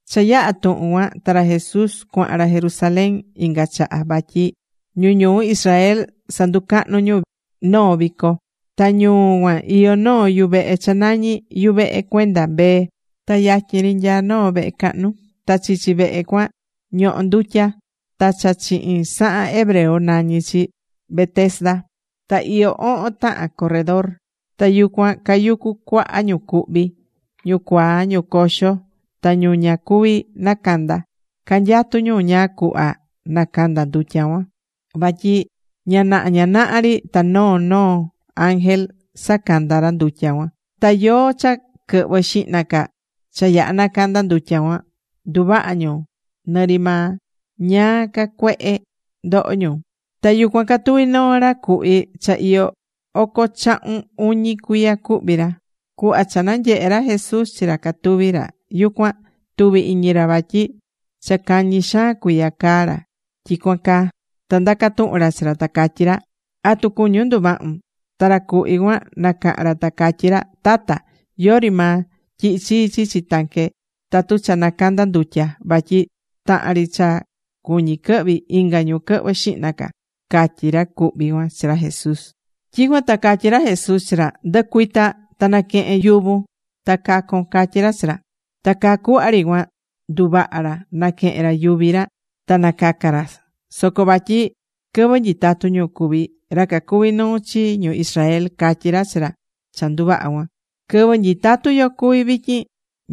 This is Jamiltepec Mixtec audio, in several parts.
Cha yaha̱ tuhun cuan ta ra Jesús cuahan ra Jerusalén inga chaha vatyi ñu ñuu Israel sanducahnu ñu noo vico. Ta ñuu cuan iyó noo yuvehe cha nañí Yuvehe Cuenda Mbee. Ta yatyin ri nyaa noo vehe cahnu. Ta chichi vehe cuan ñohó ndutya. Ta cha chihin sahan hebreo nañí chi Betesda. Ta iyó ohon tahan corredor. Ta yucuan cayucu cuaha ñu cuhví: ñu cuaa, ñu coxo, ta ñu ña cuví nacanda. Canyatú ñu ñáá cuhva nacanda ndutya cuan. Vatyi ña naha ña naha ri ta noó noo ángel sanacanda ra ndutya cuan. Ta yóó cha quɨhvɨ xihna ca cha yaha nacanda ndutya cuan, nduvaha ñu nɨri maa ñáá ca cuehe ndoho ñu. Ta yucuan catuví noo ra cuhví cha iyó oco chahun uñi cuiya cuhví ra. Cuhva cha nanyehe̱ ra Jesús chi ra catuví ra yucuan, tuvi̱ iñi ra vatyi cha cañi xaan cuiya caá ra tyicuan caa. Ta ndaca̱ tuhun ra chi ra, ta catyí ra: ―¿Atu cuñún nduvahun? Ta ra cuhví cuan nacaha̱n ra ta catyí ra: ―Tata, yori maa tyihi chii chichi tanque tatu cha nacandá ndutya. Vatyi tahan ri cha cuñí quɨhvi, inga ñu quɨhvɨ xihna ca ―catyí ra cuhví cuan chi ra Jesús. Tyicuan ta catyí ra Jesús chi ra: ―Ndɨ̱cuita ta na̱quehen yuvun ta ca̱con ―catyí ra chi ra. Ta caa cuhva ri cuan nduvaha̱ ra, naquehe̱n ra yuvi ra, ta nacaca ra. Soco vatyi quɨvɨ nyitatu ñu cuví, ra cacuví nuu chi ñu Israel catyí ra chi ra cha nduvaha̱ cuan: ―Quɨvɨ nyitatú yo cuví vityin,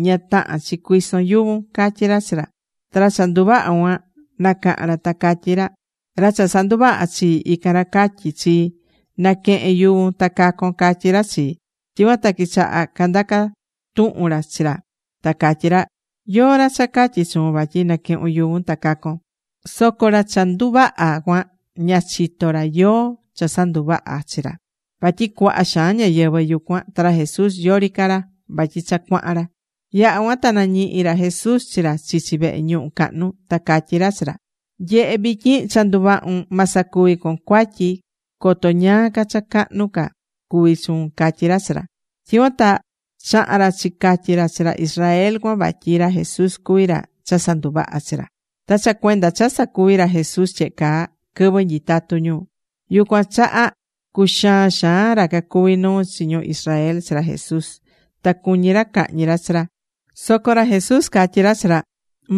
ña tahán chi cuison yuvun ―catyí ra chi ra. Ta ra cha nduvaha̱ cuan nacaha̱n ra ta catyí ra: ―Ra cha sanduvaha̱ chii, ican ra catyi̱ chii: “Na̱quehen yuvun ta ca̱con”, catyí ra chii. Tyicuan ta quichaha candaca tuhun ra chi ra, ta catyí ra: ―¿Yóó ra cha catyi̱ chuun vatyi naquehun yuvun ta cacon? Soco ra cha nduvaha̱ cuan ña chitó ra yóó cha sanduvaha̱ chi ra. Vatyi cuaha xaan ñáyɨvɨ yucuan, ta ra Jesús yori ca ra vatyi cha cuahan ra. Yaha̱ cuan ta nañihi̱ ra Jesús chi ra chichi vehe ñuhu cahnu, ta catyí ra chi ra: ―Nye̱he, vityin cha nduvahu̱n, ma sacuvi con cuatyi, coto ñáá ca cha cahnu ca cuvi chuun ―catyí ra chi ra. Tyicuan ta chaha̱n ra chicatyi ra chi ra Israel cuan vatyi ra Jesús cuví ra cha sanduvaha̱ chi ra. Ta cha cuenda cha sacuvi̱ ra Jesús tyehe caa quɨvɨ nyitatú ñu, yucuan chaha cuxaa̱n xaan ra cacuví nuu chi ñu Israel chi ra Jesús. Ta cuñí ra cahñi ra chi ra. Soco ra Jesús catyí ra chi ra: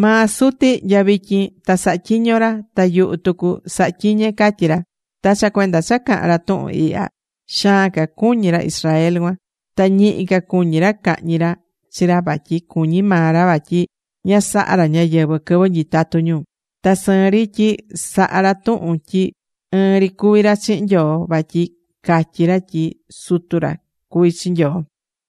―Maa Suti, nya vityin ta sahá tyiño ra. Ta yuhu tucu sahá tyiñe ―catyí ra. Ta cha cuenda cha caha̱n ra tuhun ihya, xaan ca cuñí ra Israel cuan. Ta ñihi ca cuñí ra cahñi ra chi ra vatyi cuñí maa ra vatyi ña sahá ra ñáyɨvɨ quɨvɨ nyitatu ñu, ta sɨɨn rí tyi sahá ra tuhun tyi ɨɨn ri cuví ra chihin Nyoo vatyi catyí ra tyi sutu ra cuví chi Nyoo.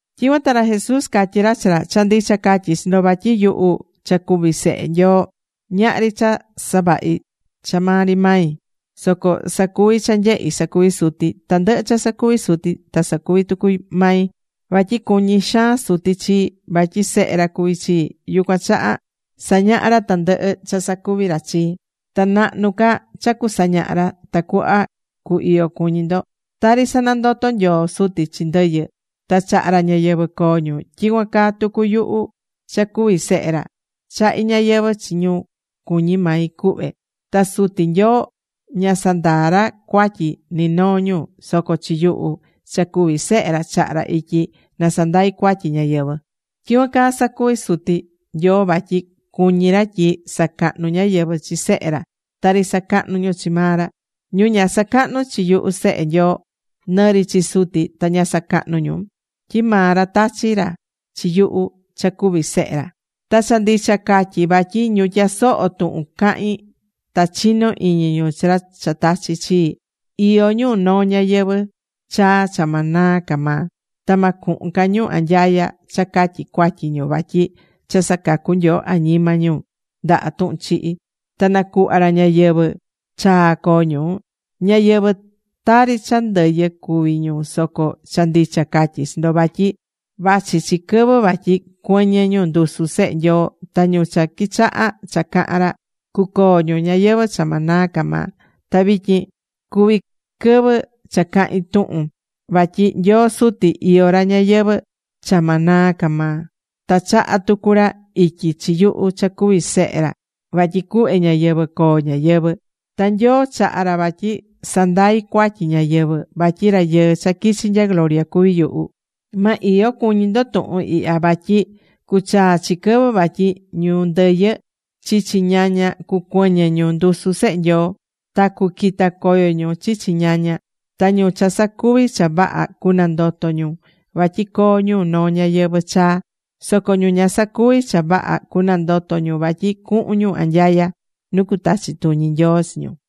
Tyicuan ta ra Jesús catyí ra chi ra: ―Cha ndicha catyí chi ndo vatyi yuhu, cha cuví Sehe Nyoo, ñahri cha savahí cha maa ri mai. Soco sacuví cha nyehí sacuví Suti. Tandɨhɨ cha sacuví Suti ta sacuvi tucu maí. Vatyi cuñí xaan Suti chii, vatyi Sehe ra cuví chii, yucuan chaha sañahá ra tandɨhɨ cha sacuví ra chii. Ta nahnu ca cha cusañaha ra, tacuhva cu iyo cuñi ndo. Tari sanandotó Nyoo Suti chi ndɨyɨ, ta chahá ra ñayɨvɨ̱ coo ñu, tyicuan caa tucu yuhu cha cuví Sehe ra, chahí ñayɨvɨ̱ chi ñu cuñí mai cuhve. Ta Suti Nyoo ña sandaa ra cuatyi ni noo ñu, soco chi yuhu cha cuví Sehe ra chaha̱ ra ityi na sandai cuatyi ñáyɨvɨ. Tyicuan caa sacuví Suti Nyoo vatyi cuñí ra tyi sacahnu ñáyɨvɨ chi Sehe ra tari sacahnú ñu chi maa ra. Ñu ña sacahnú chi yuhu Sehe Nyoo, nɨri chi Suti ta ña sacahnú ñu. Tyi maa ra tachi̱ ra chi yuhu cha cuví Sehe ra. ’Ta cha ndicha catyí vatyi ñu tyasohó tuhun cahín ta chinó iñi ñu chi ra cha tachi̱ chii, iyó ñu noo ñayɨvɨ̱ chaa cha ma naa ca maa. Ta ma cuhun ca ñu anyaya cha catyi cuatyi ñu vatyi cha sacacu̱ Nyoo añima ñu ndaha tuhun chihi, ta nacuhva̱ ra ñayɨvɨ̱ chaa coo ñu. Ñáyɨvɨ tari cha ndɨyɨ cuví ñu soco cha ndicha catyí chi ndo vatyi vachi chi quɨvɨ vatyi cuɨñɨ ñu ndusu Sehe Nyoo. Ta ñu cha quichahá cha cahán ra, cucoo ñu ñayɨvɨ̱ cha ma naa ca maa. Ta vityin cuví quɨvɨ cha cahín tuhun. Vatyi Nyoo Suti iyó ra ñayɨvɨ̱ cha ma naa ca maa. Ta chaha̱ tucu ra ityi chi yuhu cha cuví Sehe ra vatyi cuhve ñayɨvɨ̱ coo ñáyɨvɨ. Ta Nyoo chaha̱ ra vatyi sandai cuatyi ñáyɨvɨ, vatyi Rayɨɨ cha quichi nya gloria cuví yuhu. Ma iyo cuñi ndo tuhun ihya, vatyi cuchaa chi quɨvɨ vatyi ñu ndɨyɨ chichi ñaña cucuɨñɨ ñu ndusu Sehe Nyoo. Ta cuquita coyo ñu chichi ñaña. Ta ñu cha sacuvi̱ cha vaha cunandoto ñu vatyi coo ñu noo ñayɨvɨ̱ chaa. Soco ñu ña sacuvi̱ cha vaha cunandoto ñu vatyi cuhun ñu anyaya nu cutachi tuñi Nyoo chi ñu.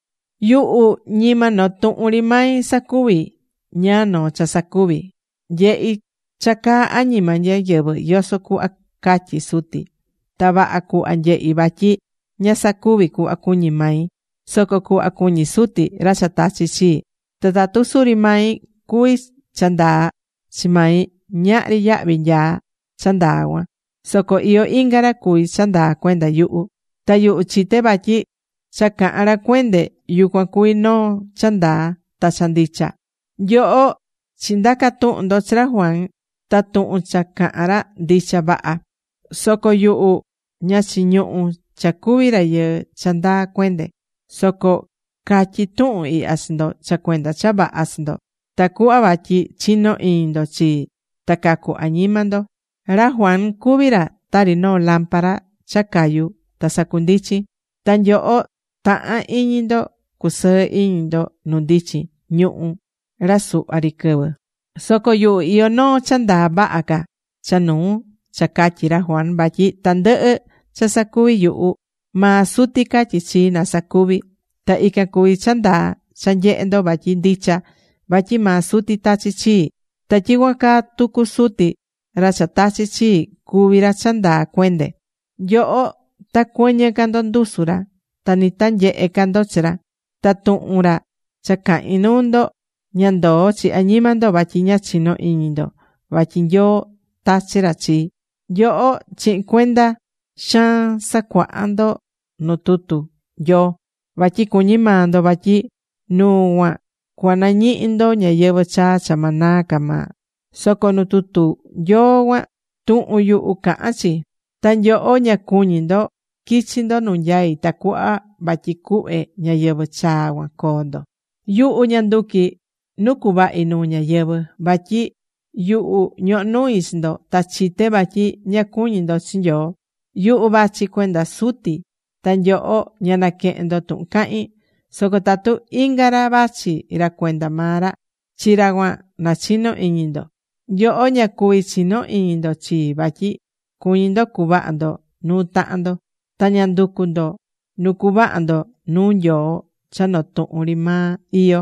’Yuhu ñima noo tuhun ri mai sacuví ñáá noo cha sacuví. Nyehí cha caá añima ñáyɨvɨ yoso cuhva catyí Suti. Ta vaha cuhva nyehí vatyi ña sacuví cuhva cuñí mai, soco cuhva cuñí Suti, ra cha tachi̱ chii. Ta tatu suri mai cuví cha ndaa chi mai, ñahri yahvi nyaá cha ndaa cuan. Soco iyó inga ra cuví cha ndaa cuenda yuhu. Ta yuhu chité vatyi cha cahán ra cuende yucuan cuví noo cha ndaa ta cha ndicha. Nyoho chindaca̱ tuhun ndo chi ra Juan. Ta tuhun cha caha̱n ra, ndicha vaha. Soco yuhu ña chiñuhú cha cuví rayɨɨ cha ndaa cuende. Soco catyí tuhun ihya chi ndo cha cuenda cha vaha chi ndo, tacuhva vatyi chino iñi ndo chii ta cacu añima ndo. Ra Juan cuvi̱ ra tari noo lámpara cha cayú ta sacundichín. Ta nyoho taha̱n iñi ndo cusɨɨ iñi ndo nu ndichin ñuhu̱ ra suhva ri quɨvɨ. Soco yuhu iyó noo cha ndaa vaha ca cha nuu cha catyi̱ ra Juan. Vatyi tandɨhɨ cha sacuví yuhu, maa Suti catyí chii na sacuvi. Ta ican cuví cha ndaa cha nyehé ndo vatyi ndicha vatyi maa Suti tachi̱ chii. Ta tyicuan caa tucu Suti, ra cha tachi̱ chii, cuví ra cha ndaa cuende. Nyoho ta cuɨñɨ ca ndo ndusu ra. Ta ni ta nyehe ca ndo chi ra. Ta tuhun ra cha cahín nuu ndo, ña ndoó chi añima ndo vatyi ña chinó iñi ndo vatyi Nyoo tachi̱ ra chii. Nyoho chihin cuenda xaan sacuaha ndo nu tutu Nyoo, vatyi cuñí maa ndo vatyi nuu cuan cuanañihi ndo ñayɨvɨ chaa̱ cha ma naa ca maa. Soco nu tutu Nyoo cuan, tuhun yuhu cahán chi. Ta nyoho ña cuñí ndo quichi ndo nu nyaí tacuhva vatyi cuhve ñayɨvɨ̱ chaa cuan coo ndo. ’Yuhu ña nduqui nu cuvahi nuu ñáyɨvɨ. Vatyi yuhu ñohó nui chi nyoho ta chité vatyi ña cuñí ndo chi Nyoo. Yuhu vachi cuenda Suti ta nyoho ña naquehén ndo tuhun cahín. Soco tatu inga ra vachi ra cuenda maa ra, chi ra cuan nachino iñi ndo. Nyoho ña cuví chino iñi ndo chii vatyi cuñí ndo cuvaha ndo nu tahan ndo. Ta ña nducú ndo nu cuvaha ndo nuu Nyoo cha noo tuhun ri maa iyó.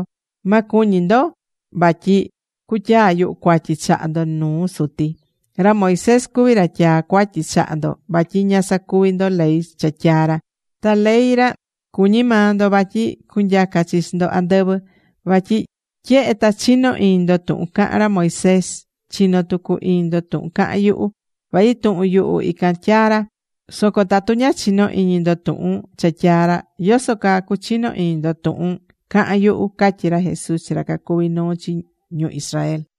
Ma cuñi ndo vatyi cutyaa yuhu cuatyi chaha ndo nuu Suti. Ra Moisés cuví ra tyaá cuatyi chaha ndo vatyi ña sacuví ndo ley cha tyaa̱ ra. Ta ley ra cuñí maa ndo vatyi cunyaca chi chi ndo andɨvɨ. Vatyi tyehe ta chinó iñi ndo tuhun caha̱n ra Moisés, chinó tucu iñi ndo tuhun cahán yuhu. Vatyi tuhun yuhu ican tyaa̱ ra. Soco tatu ña chinó iñi ndo tuhun cha tyaa̱ ra, ¿yoso caa cuchino iñi ndo tuhun cahán yuhu? ―catyí ra Jesús chi ra cacuví nuu chi ñu Israel.